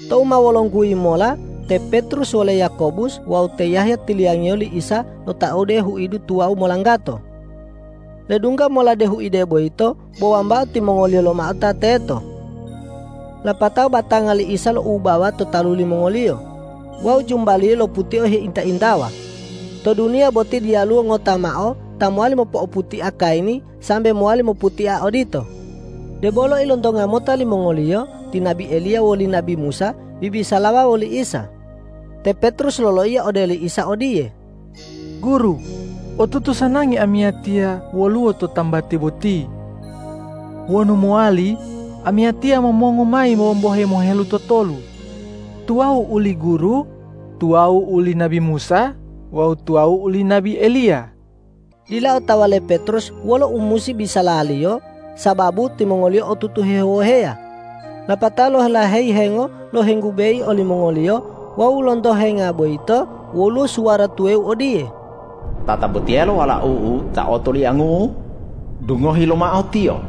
Tou ma wolongguyi mola te Petrus wole Yakobus wawu te Yahya tiliyangiyo li Isa lotaodu huide tuwawu molanggato. Ledungga mola de huide boyito bo wambao timongoliyo lomao ta teto. Lapatao batanga li Isa loubawa to talu limongoliyo. Wawu jumba-Liyo loputia heinta-intawa. To duniya boti diyaluwo ngota mao ta mowali mopo'oputia kayini sambe mowali moputia odito. Debolo ilontonga mota limongoliyo ti nabi Eliya woli nabi Musa bibisalawa woli Isa. Te Petrus loloiya ode li Isa odiye,”Guru, otutu sanangi amiyatiya woluwo to tambati boti. Wonu mowali, amiyatiya momongu mayi wombohe mohelutotolu, tuwawu uli Guru, tuwawu uli nabi Musa wawu tuwawu uli nabi Eliya.” Dila otawa le Petrus wolo u musi bisalaliyo, sababu timongoliyo otutu hewoheya. Lapatao lolaheyi hengo lohenggubeyi olimongoliyo wawu lonto henga boyito woluwo suwara tuwawu odiye,”Tatabotiyelo Walau-U ta otoliangu-U, dungohi lomao Tiyo.”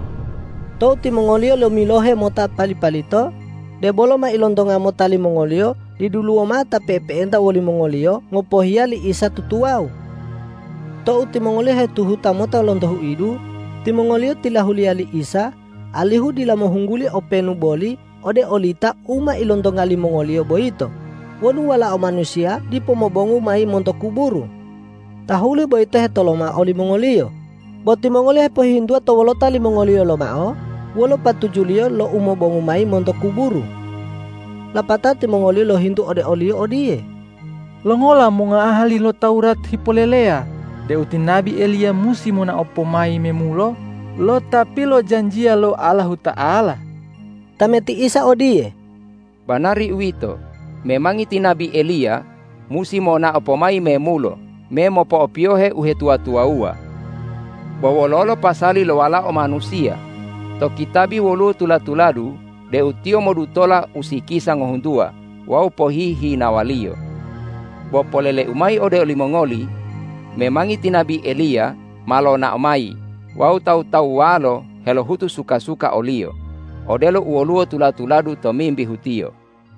Tou timongoliyo lomilohe mota pali-palito, debolo ma ilontonga mota limongoliyo diduluwo mao ta pe'epe'enta wolimongoliyo ngopohiya li Isa tutuwawu. Tou timongoliyo hetuhuta mota lonto huidu, timongoliyo tilahuliya li Isa alihu dila mohungguli openu boli ode olita u ma ilontonga limongoliyo boyito wonu Walao Manusiya dipo mobongu mayi monto kuburu. Tahuli boyito hetoloma olimongoliyo, bo timongoliyo hepohihintuwa to wolota limongoliyo lomao wolo patujuliyo lo umobongu mayi monto kuburu. Lapatao timongoliyo lohintu ode o-Liyo odiye,”Longola mongoahali lo Tawurat hipoleleya deu ti nabi Eliya musi monao pomayi memulo lo Ta pilojanjiya lo Allahuta'ala?” Tameti Isa odiye,”Banari uwito, memangi ti nabi Eliya musi monao pomayi memulo me mopo'opiyohe uhetuwa-tuwawuwa. Bo wololo pasali lo Walao Manusiya? To kitabi woluwo tula-tuladu deu Tiyo modutola usikisa ngohuntuwa wawu pohihinawaliyo. Bo polele-U mayi ode olimongoli: Memangi ti nabi Eliya ma lonao mayi wawu tawu-tawuwalo helohutu suka-suka oliyo, odelo u woluwo tula-tuladu tomimbihu tiyo.”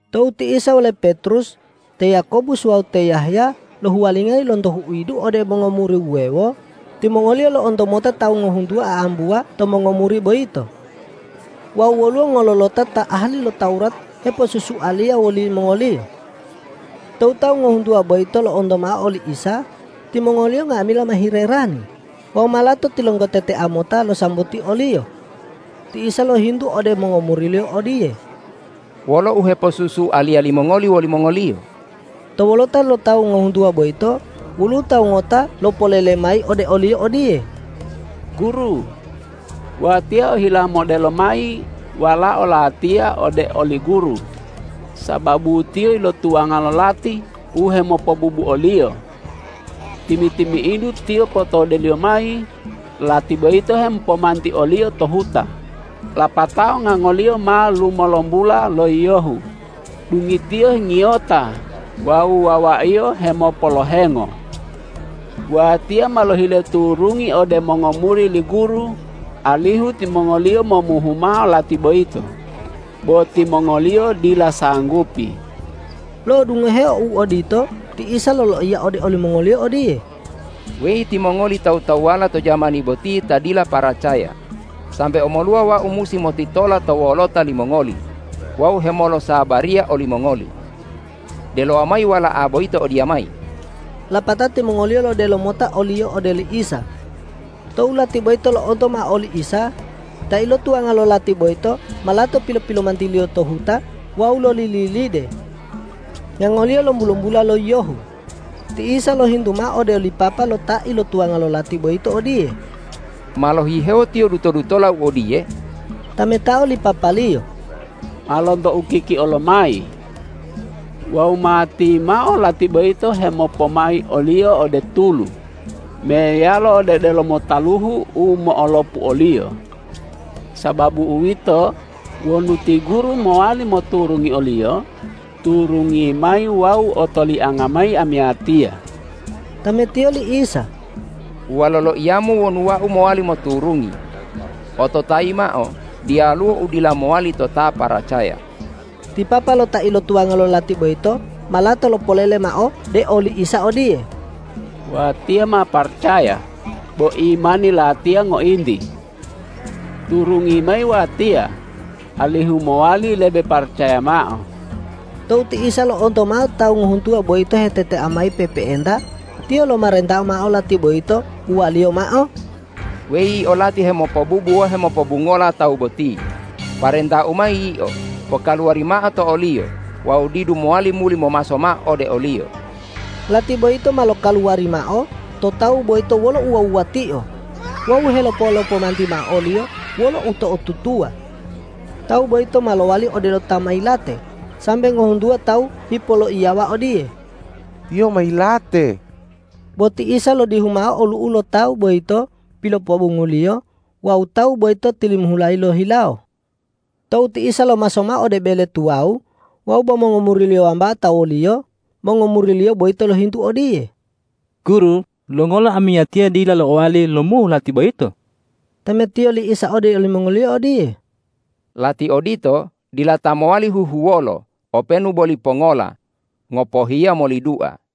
Tou ti Isa wole Petrus, te Yakobus wawu te Yahya lohuwalingayi lonto huidu ode mongomuri wuwewo, timongoliyo lo'onto mota tawu ngohuntuwa a'ambuwa to mongomuri boyito.Wawu woluwo ngololota ta ahali lo Tawurat heposusualiya wolimongoliyo. Tou tawu ngohuntuwa boyito lo'onto mao oli Isa, timongoliyo nga'amila ma hilerani wawu ma lato tilonggotetea mota losambuti o-Liyo. Ti Isa lohintu ode mongomuri-Liyo odiye,”Wolo uheposusualiya limongoli wolimongoliyo?” To wolota lo tawu ngohuntuwa boyito woluwo tawu ngota ta lopolele mayi ode o-Liyo odiye,”Guru, watiya ohila modelo mayi walao latiya ode oli Guru, sababu tiyo ilotuwanga lo lati u hemopobubu oliyo. Timi-timi'idu tiyo potodeliyo mayi, lati boyito hemopomanti oliyo to huta, lapatao ngangoliyo ma lumolombula lo yiyohu, dungitiyo hengiyota wawu wawaiyo hemopolohengo. Watiya ma lohile turungi ode mongomuri li Guru alihu timongoliyo momuhu mao lati boyito, bo timongoliyo dila sanggupi.” Lo'odungoheo u odito ti Isa loloiya ode olimongoliyo odiye,”Weyi timongoli tawu-tawuwala to jamani boti ta dila paracaya, sambe omoluwa Wau musi motitola to wolota limongoli wawu hemolosabariya olimongoli? Delowa mayi wala'a boyito odiyamayi!” Lapatao timongoliyo lodelo mota oliyo ode li Isa. Tou lati boyito lo'onto mao oli Isa, ta ilotuwanga lo lati boyito ma lato pilo-pilomantiliyo to huta wawu lolililide. Ngangoliyo lombu-lombula lo yiyohu. Ti Isa lohintu mao ode li papa lo ta ilotuwanga lo lati boyito odiye,”Ma lohihewo tiyo duto-dutola u odiye?” Tametao li papaliyo,”Ma lonto ukikio lomayi. Wawu matimao lati boyito hemopomai oliyo ode tulu meyalo ode delomo taluhu u mo'olopu oliyo. Sababu uwito, wonu ti Guru mowali moturungi oliyo, turungi mayi wawu otolianga mayi amiyatiya.” Tametiyo li Isa,”Uwalo loiyamu wonu Wau mowali moturungi. Ototayi mao: Diyaluwo u dila mowali to ta paracaya!” Ti papa lo ta ilotuwanga lo lati boyito ma lato lopolele mao de oli Isa odiye,”Watiya ma paracaya, bo imani latiya ngointi. Turungi mayi watiya alihu mowali lebe paracaya mao!” Tou ti Isa lo'onto mao tawu ngohuntuwa boyito hetetea mayi pe'epe'enta, Tiyo lomarenta mao lati boyito, uwa-Liyo mao,”Weyi yio lati hemopobubu wawu hemopobungola tawu boti, parenta-U mayi yio: Pokaluwari mao to oliyo wawu didu mowali muli momaso mao ode oliyo!” Lati boyito ma lokaluwari mao to tawu boyito wolo uwuwa-wuwatio wawu helopo-lopomanti mao oliyo wolo uto'otutuwa. Tawu boyito ma lowali odelo ta ma yilate, sambe ngohuntuwa tawu hipoloiyawa odiye,”Tiyo ma yilate.” Bo ti Isa lodihu mao olu'u lo tawu boyito pilopobongu-Liyo wawu tawu boyito tilimihulayi lohihilawo. Tou ti Isa lomaso mao ode bele tuwawu wawu bo mongomuri-Liyo wambao ta wo-Liyo, mongomuri-Liyo boyito lohintu odiye,”Guru, longola amiyatiya dila lo'owali lomuhu lati boyito?” Tametiyo li Isa ode olimongoliyo odiye,”Lati odito dila ta mowali huhuwolo openu boli pongola, ngopohiya moli dua.”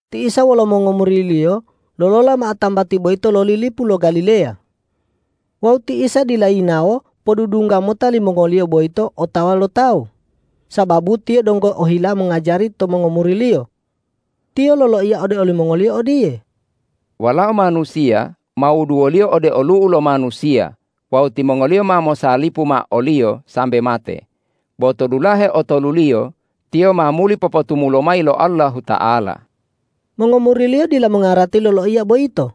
Ti Isa wolo mongomuri-Liyo lolola mao tambati boyito loli lipu lo Galileya. Wawu ti Isa dila yinawo podudungga mota limongoliyo boyito otawa lo tawu, sababu Tiyo donggo ohila mongajari to mongomuri-Liyo. Tiyo loloiya ode olimongoliyo odiye,”Walao Manusiya ma wuduwoliyo ode olu'u lo manusiya wawu timongoliyo ma mosalipu mao o-Liyo sambe mate, bo to dulahe otoluliyo Tiyo ma muli popotumulo mayi lo Allahuta'ala.” Mongomuri-Liyo dila mongarati loloiya boyito,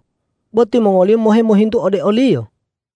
bo timongoliyo mohe mohintu ode o-Liyo.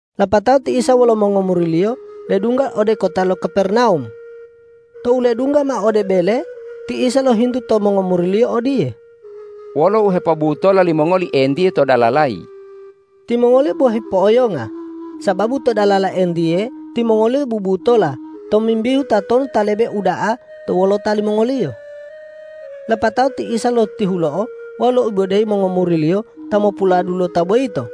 Lapatao ti Isa wolo mongomuri-Liyo ledungga ode kota lo Kapernawum. Tou ledungga mao ode bele, ti Isa lohintu to mongomuri-Liyo odiye,”Wolo u hepobutola limongoli entiye to dalalayi?” Timongoliyo bo hipo'oyonga, sababu to dalala entiye timongoliyo bubutola tomimbihu tatonu ta lebe uda'a to wolota limongoliyo. Lapatao ti Isa lotihulo'o wawu loibodeyi mongomuri-Liyo ta mopuladulota boyito.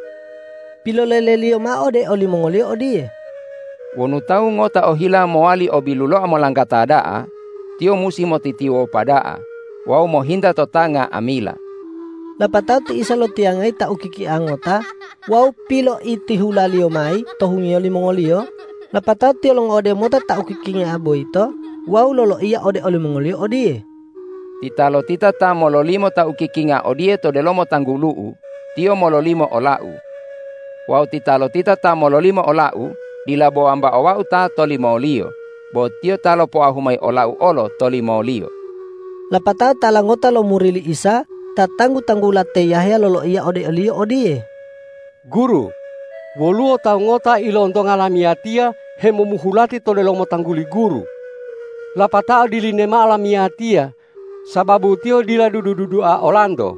Pilolele-Liyo mao ode olimongoliyo odiye,”Wonu tawu ngota ohila mowali o biluloa molanggata da'a, tiyo musi motitiwopa da'a wawu mohinta to ta nga'amila.” Lapatao ti Isa lotiyangayi ta ukikinga ngota wawu piloitihula-Liyo mayi to hungiyo limongoliyo, lapatao Tiyo longo'ode mota ta ukikinga boyito wawu loloiya ode olimongoliyo odiye, ”Titalotita ta mololimo ta ukikinga odiye to delomo tanggulu-U, tiyo mololimo ola-U. Wawu titalotita ta mololimo ola-U dila bo wambao Wau ta tolimoliyo, bo Tiyo ta lopoahu mayi ola-U olo tolimoliyo.” Lapatao tala ngota lo muri li Isa ta tanggu-tanggula te Yahya loloiya ode o-Liyo odiye,”Guru, woluwo tawu ngota ilontonga lamiyatiya hemomuhu lati to delomo tangguli Guru, lapatao dilini mao lamiyatiya sababu tiyo dila dudu-dudua olanto.”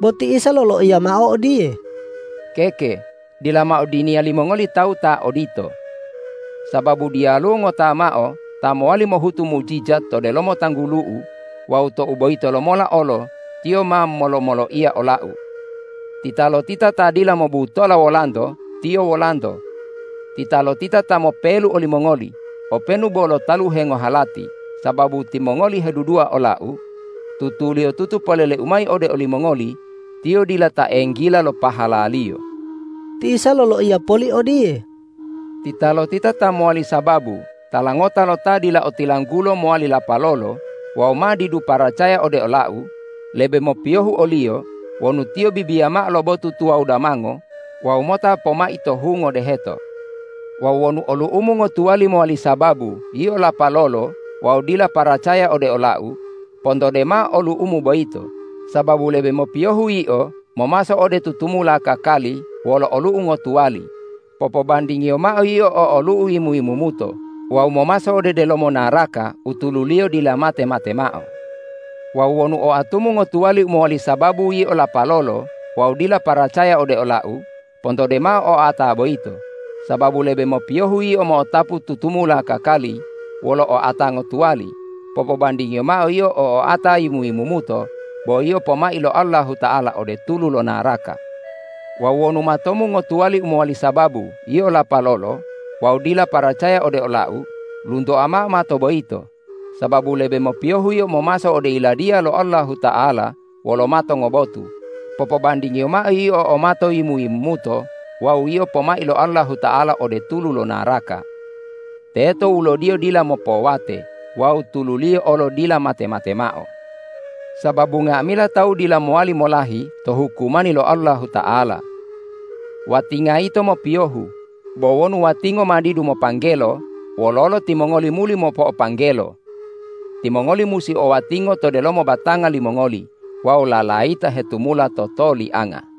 Bo ti Isa loloiya mao odiye,”Keke, dila mao diniya limongoli tawu ta odito! Sababu diyaluwo ngota mao ta mowali mohutu mujijat to delomo tanggulu-U wawu tou boyito lomola olo tiyo ma molo-moloiya ola-U. Titalotita ta dila mobutola wolanto, tiyo wolanto. Titalotita ta mopelu olimongoli openu bo lo taluhe ngohalati sababu timongoli hedudua ola-U, tutuliyotutu polele-U mayi ode olimongoli: Tiyo dila ta enggila lo pahalaliyo.” Ti Isa loloiya poli odiye,”Titalotita ta mowali sababu tala ngota lo ta dila otilanggulo mowali lapalolo wawu ma didu paracaya ode ola-U, lebe mopiyohu oliyo wonu tiyo bibiya mao lo botu tuwawu damango wawu mota pomai to hungo deheto. Wawu wonu olu'umu ngotuwali mowali sababu yio lapalolo wawu dila paracaya ode ola-U, pontode mao olu'umu boyito, sababu lebe mopiyohu yio momaso ode tutumula kakali wolo olu'u ngotuwali, popobandingiyo mao yio o olu'u yimu-yimumuto wawu momaso ode delomo naraka u tululiyo dila mate-mate mao. Wawu wonu oatumu ngotuwali u mowali sababu yio lapalolo wawu dila paracaya ode ola-U, pontode mao oata boyito, sababu lebe mopiyohu yio mo'otapu tutumula kakali wolo oata ngotuwali, popobandingiyo mao yio o oata yimu-yimumuto, bo yio pomai lo Allahuta'ala ode tulu lo naraka. Wawu wonu matomu ngotuwali u mowali sababu yio lapalolo wawu dila paracaya ode ola-U, luntoa mao mato boyito, sababu lebe mopiyohu yio momaso ode Yiladiya lo Allahuta'ala wolo mato ngobotu, popobandingiyo mao yio o mato yimu-yimumuto wawu yio pomai lo Allahuta'ala ode tulu lo naraka. Teto wulodiyo dila mopowate wawu tululiyo olo dila mate-mate mao. Sababu nga'amila tawu dila mowali molahi to hukumani lo Allahuta'ala. Watinga yito mopiyohu. Bo wonu watingo ma didu mopanggelo, wololo timongoli muli mopo'opanggelo? Timongoli musi o watingo to delomo batanga limongoli wawu lalayita hetumula totolianga.”